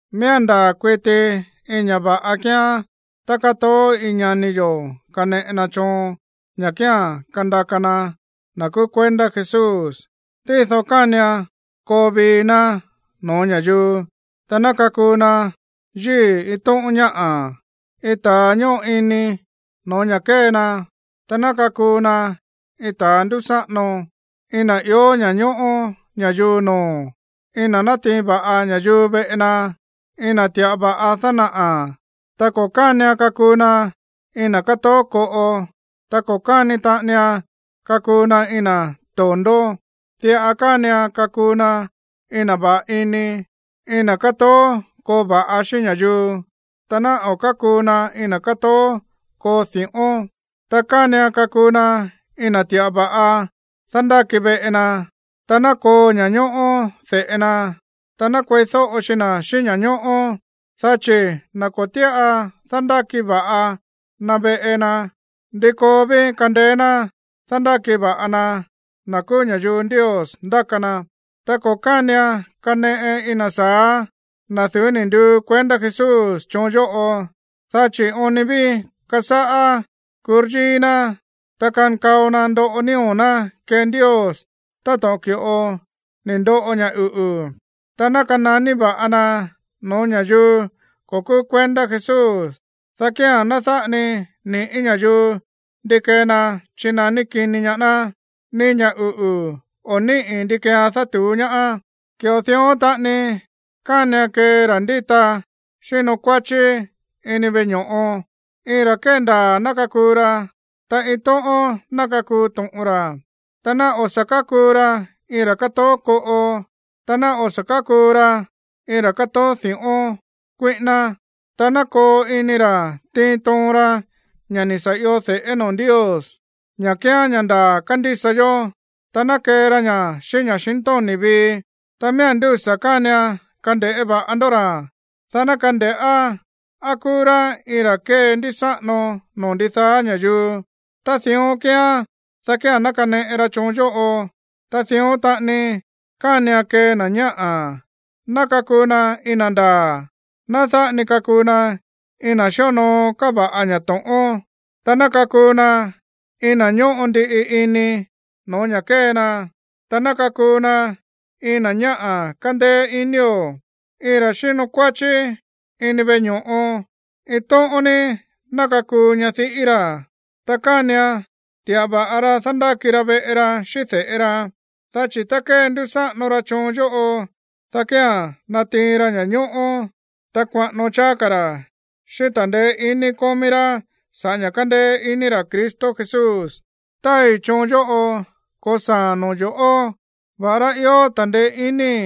Miía̱n ndaa̱ kuiti iin ña̱ va̱ꞌa kíán tá kátoó iin ñani yo̱ kaneꞌe na choon ña̱ kía̱n kandaka na na̱ kúú kuendá Jesús. Tído kánian koo vii ná no̱ó ña̱yuu, ta ná kakuu na yíi̱ iin tóꞌón ñáꞌa̱, iin ta̱a ñóꞌo ini no̱ó ña̱ kée na, ta ná kakuu na iin ta̱a ndúsáꞌano, iin na̱ ió ña̱ñóꞌó ña̱yuu noo̱, iin na̱ nátiin va̱ꞌa ña̱yuu veꞌe na, iin na̱ ti̱ꞌa va̱ꞌa dánaꞌa̱. Ta ko̱ kánian kakuu na iin na̱ kátoó koꞌo, ta ko̱ káni taꞌanian kakuu na iin na̱ to̱ndó. Diꞌa kánian kakuu na iin na̱ va̱ꞌa ini, iin na̱ kátoó koo va̱ꞌa xíꞌín ña̱yuu, ta ná o̱ kákuu na iin na̱ kátoó koo di̱ꞌón. Ta kánian kakuu na iin na̱ ti̱ꞌa va̱ꞌa dándáki veꞌe na, ta ná koo ña̱ñóꞌó de̱ꞌe na, ta ná kueídóꞌo xi na̱ xíꞌín ña̱ñóꞌó. Dá chi̱, na̱ ko̱ tíꞌa dándáki va̱ꞌa na̱ veꞌe na, ¿ndi koo ví kandeé ná dándáki va̱ꞌa na na̱ kúú ña̱yuu Ndios ndáka na? Ta ko̱ kánian kaneꞌe iin na̱ sa̱á, na̱ du̱ú ni̱ nduu kuendá Jesús, choon yóꞌo, dá chi̱ oon ni ví kasáꞌá kuryíí ná, ta kankao na ndoꞌo nío̱ ná kee Ndios táto̱ꞌon ki̱ꞌo ni̱ ndoꞌo ña̱ uꞌu̱. Ta ná kananí va̱ꞌa na no̱ó ña̱yuu ko̱ kúú kuendá Jesús, dá kía̱n ná dáꞌa ni ni̱ꞌí ña̱yuu ndi kee na chínaní kini ñaá ná, ni ña̱ uꞌu̱ o̱ níꞌi̱ ndi keean dátu̱ú ñaá. Ki̱ꞌo dión taꞌani kánian kee ra̱ ndíta xíno kuáchí ini veꞌe ño̱ꞌo. Iin ra̱ kéndaa̱ ná kakuu ra, ta iin tóꞌón ná kakuu to̱ꞌon ra. Ta ná o̱ sa̱ kákuu ra iin ra̱ kátoó koꞌo, ta ná o̱ sa̱ kákuu ra iin ra̱ kátoó di̱ꞌón kuíꞌíná. Ta ná koo ini ra̱ tiin toon ra ña̱ ni̱ sa̱ io de̱ꞌé noo̱ Ndios, ña̱ kíán ña̱ ndaa̱ kándísa yó, ta ná kee ra ña̱ xíꞌín ña̱xintóni̱ vii. Ta miía̱n ndúsa̱ kánian kande̱ꞌé va̱ꞌa ndó ra̱, dá ná kande̱ꞌá á kúú rá iin ra̱ kéndísáꞌano noo̱ ndidaá ña̱yuu. Tá dión kíán, dá kía̱n ná kaneꞌe ra choon yóꞌo. Ta dión taꞌani kánian kee na̱ ñáꞌa̱, ná kakuu na iin na̱ ndaa̱, ná dáꞌa ni kakuu na iin na̱ xíonoo káva̱ꞌa ña̱ to̱ꞌón, ta ná kakuu na iin na̱ ñóꞌo ndiꞌi ini no̱ó ña̱ kée na, ta ná kakuu na iin na̱ ñáꞌa̱ kándéé inío̱. Iin ra̱ xíno kuáchí ini veꞌe ño̱ꞌo, iin tóꞌón ní ná kakuu ñadiꞌí ra̱, ta kánian ti̱ꞌa va̱ꞌa ra dándáki ra veꞌe ra xíꞌín de̱ꞌe ra. Dá chi̱ tá kendúsáꞌano ra choon yóꞌo, dá kía̱n natiin ra ña̱ñóꞌó, ta kuaꞌano cháá ka̱ ra̱ xíꞌín ta̱ndeé iní kómí rá sa̱ꞌá ña̱ kándéé ini ra̱ Cristo Jesús. Táai choon yóꞌo ko̱saa̱a̱n no̱ó yo̱ꞌó, va̱ꞌará ió ta̱ndeé iníi̱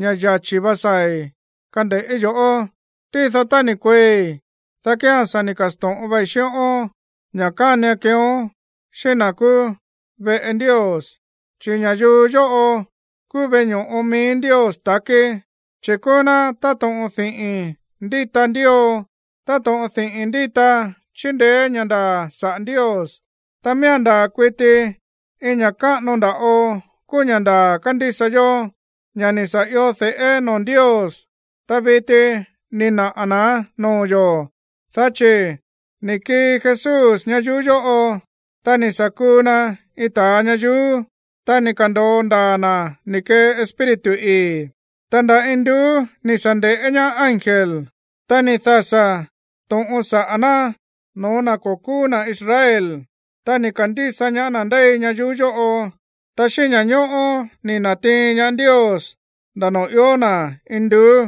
ña̱ yachi̱ vá saa̱i̱ kande̱ꞌí yo̱ꞌó. Tído tá ni̱ kueei̱, dá kía̱n sa̱ ni̱ ka̱sto̱ꞌon vei xíꞌón ña̱ kánian keeón xíꞌín na̱ kúú veꞌe Ndios, chi̱ ña̱yuu yóꞌo kúú veꞌe ño̱ꞌo mií Ndios takí, chi̱ kúú ná táto̱ꞌon diꞌi̱n ndíta ndío, táto̱ꞌon diꞌi̱n ndíta chíndeé ña̱ ndaa̱ sa̱ꞌá Ndios. Ta miía̱n ndaa̱ kuiti iin ña̱ káꞌano nda̱ꞌo kúú ña̱ ndaa̱ kándísa yó, ña̱ ni̱ sa̱ io de̱ꞌé noo̱ Ndios, ta viti ni̱ naꞌa̱ na̱án noo̱ yo̱, dá chi̱: Ni̱ kii Jesús ñayuú yóꞌo, ta ni̱ sa̱ kuu na iin ta̱a ñayuú, ta ni̱ ka̱ndo̱o ndaa̱ na̱ ni̱ kee Espíritu ii̱. Ta nda̱ induú ni̱ sa̱ nde̱ꞌé ñaá ángel. Ta ni̱ dasa̱ to̱ꞌon saꞌa̱ ná no̱ó na̱ ko̱ kúú na̱ Israel. Ta ni̱ ka̱ndísa ñaá na̱ ndéi ñayuú yóꞌo, ta xíꞌín ña̱ñóꞌó ni̱ na̱tiin ñaá Ndios nda̱ noo̱ ió na̱ induú.